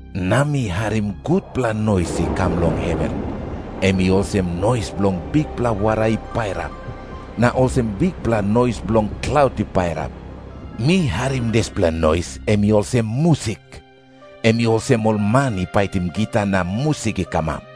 Na mi harim gutpela nois i kam long heven, em i olsem nois bilong bikpela wara i pairap, na olsem bikpela nois bilong klaut i pairap. Mi harim dispela nois em i olsem musik. Em i olsem ol man i paitim gita na musik i kamap.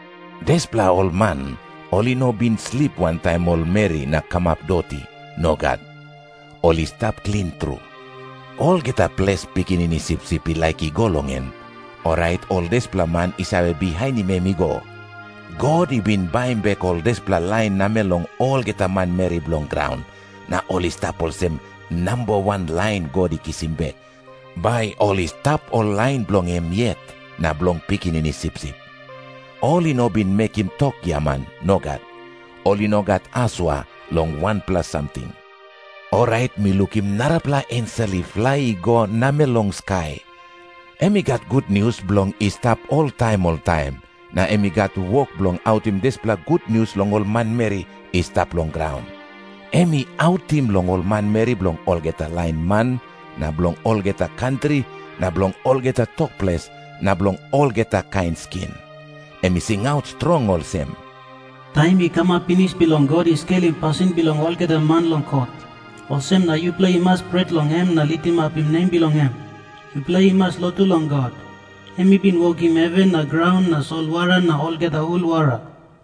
Dispela ol man ol i no bin slip wantaim ol meri na kamap doti. Nogat. Ol i stap klin tru. Olgeta ples Pikinini Sipsip i laik i go long en, orait ol dispela man i save bihainim em i go. God i bin baim bek ol dispela lain namel long olgeta manmeri bilong graun, na ol i stap olsem namba wan lain God i kisim bek, bai ol i stap ol lain bilong em yet na bilong Pikinini Sipsip. Ol i no bin mekim tok giaman. Nogat. Ol i no gat asua long wanpela samting. Orait mi lukim narapela ensel i flai i go namel long skai. Em i gat gutnius bilong i stap oltaim oltaim, na em i gat wok bilong autim dispela gutnius long ol manmeri i stap long graun. Em i autim long ol manmeri bilong olgeta lain man na bilong olgeta kantri na bilong olgeta tok ples na bilong olgeta kain skin. Em i singaut strong olsem, "Taim i kamap pinis bilong God i skelim pasin bilong olgeta man long kot. Olsem na yupela i mas pret long em na litimapim nem bilong em. Yupela i mas lotu long God, em i bin wokim heven na graun na solwara na olgeta hul wara."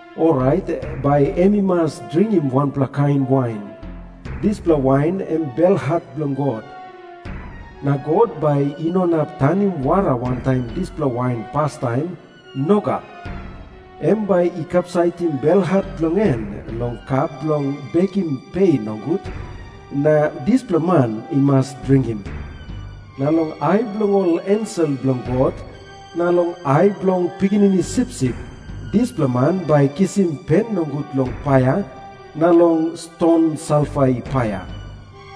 orait bai em i mas dringim wanpela kain wain. Dispela wain em belhat bilong God. Na God bai i no inap tanim wara wantaim dispela wain pastaim. Nogat. Em bai i kapsaitim belhat bilong en long kap bilong bekim pe nogut, na dispela man i mas dringim. Na long ai bilong ol ensel bilong God, na long ai bilong Pikinini Sipsip, dispela man bai i kisim pen nogut long paia na long ston salfa i paia.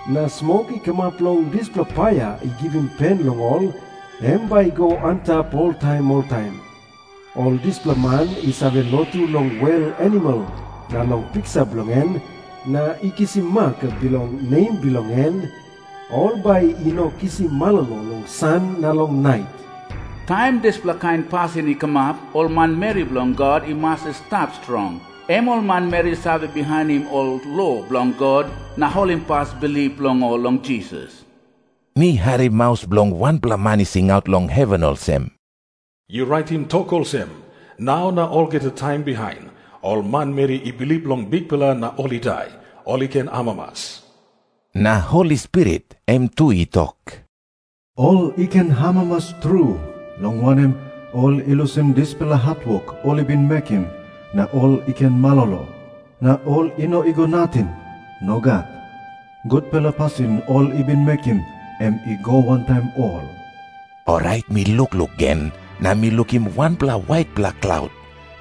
Na smok i kamap long dispela paia i givim pen long ol, em bai i go antap oltaim oltaim. Ol dispela man i save lotu long wel animal na long piksa bilong en, na i kisim mak bilong nem bilong en, ol bai i no kisim malolo long san na long nait." Taim dispela kain pasin i kamap, ol manmeri bilong God i mas i stap strong, em ol manmeri i save bihainim ol lo bilong God na holimpas bilip bilong ol long Jisas. Mi harim maus bilong wanpela man i singaut long heven olsem, "Yu raitim tok olsem, 'Nau na olgeta taim bihain, ol manmeri i bilip long Bikpela na ol i dai, ol i ken amamas." … Na Holi Spirit em tu i tok, "Ol i ken amamas tru, long wanem, ol i lusim dispela hatwok ol i bin mekim, na ol i ken malolo. Na ol i no i go nating. Nogat. Gutpela pasin ol i bin mekim, em i go wantaim ol." Orait mi lukluk gen, na mi lukim wanpela waitpela klaut,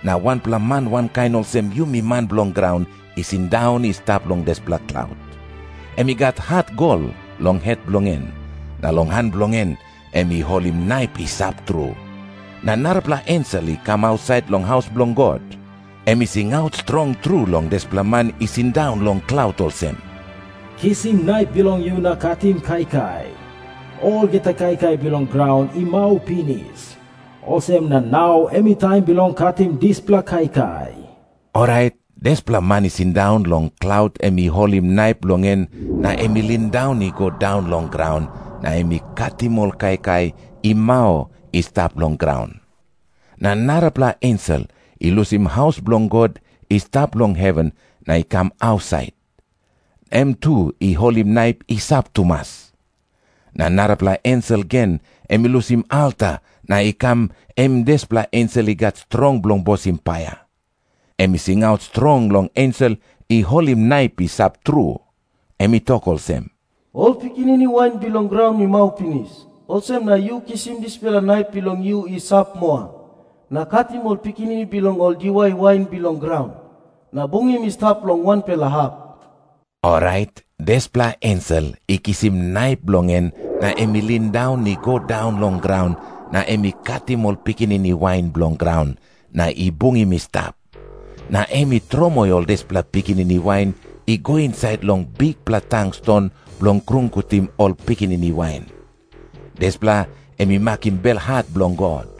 na wanpela man i wankain olsem yumi man bilong graun i sindaun i stap long dispela klaut. Em i gat hat gol long het bilong en, na long han bilong en em i holim naip i sap tru. Na narapela ensel i kam ausait long haus bilong God. Em i singaut strong tru long dispela man i sindaun long klaut olsem, "Kisim naip bilong yu na katim kaikai. Olgeta kaikai bilong graun i mau pinis, olsem na nau em i taim bilong katim dispela kaikai." Orait dispela man i sindaun long klaut em i holim naip bilong en na em i lindaun i go daun long graun, na em i katim ol kaikai i mau i stap long graun. Na narapela ensel i lusim haus bilong God i stap long heven na i kam ausait. Em tu i holim naip i sap tumas. Na narapela ensel gen em i lusim alta na i kam, em dispela ensel i gat strong bilong bosim paia. Em i singaut strong long ensel i holim naip i sap tru. Em i tok olsem, "Ol pikinini wain bilong graun i mau pinis, olsem na yu kisim dispela naip bilong yu i sap moa, na katim ol pikinini bilong ol diwai wain bilong graun, na bungim i stap long wanpela hap." Orait dispela ensel i kisim naip bilong en na em i lindaun i go daun long graun, na em i katim ol pikinini wain bilong graun, na i bungim i stap. Na em i tromoi ol dispela pikinini wain i go insait long bikpela tang ston bilong krungutim ol pikinini wain. Dispela em i makim belhat bilong God.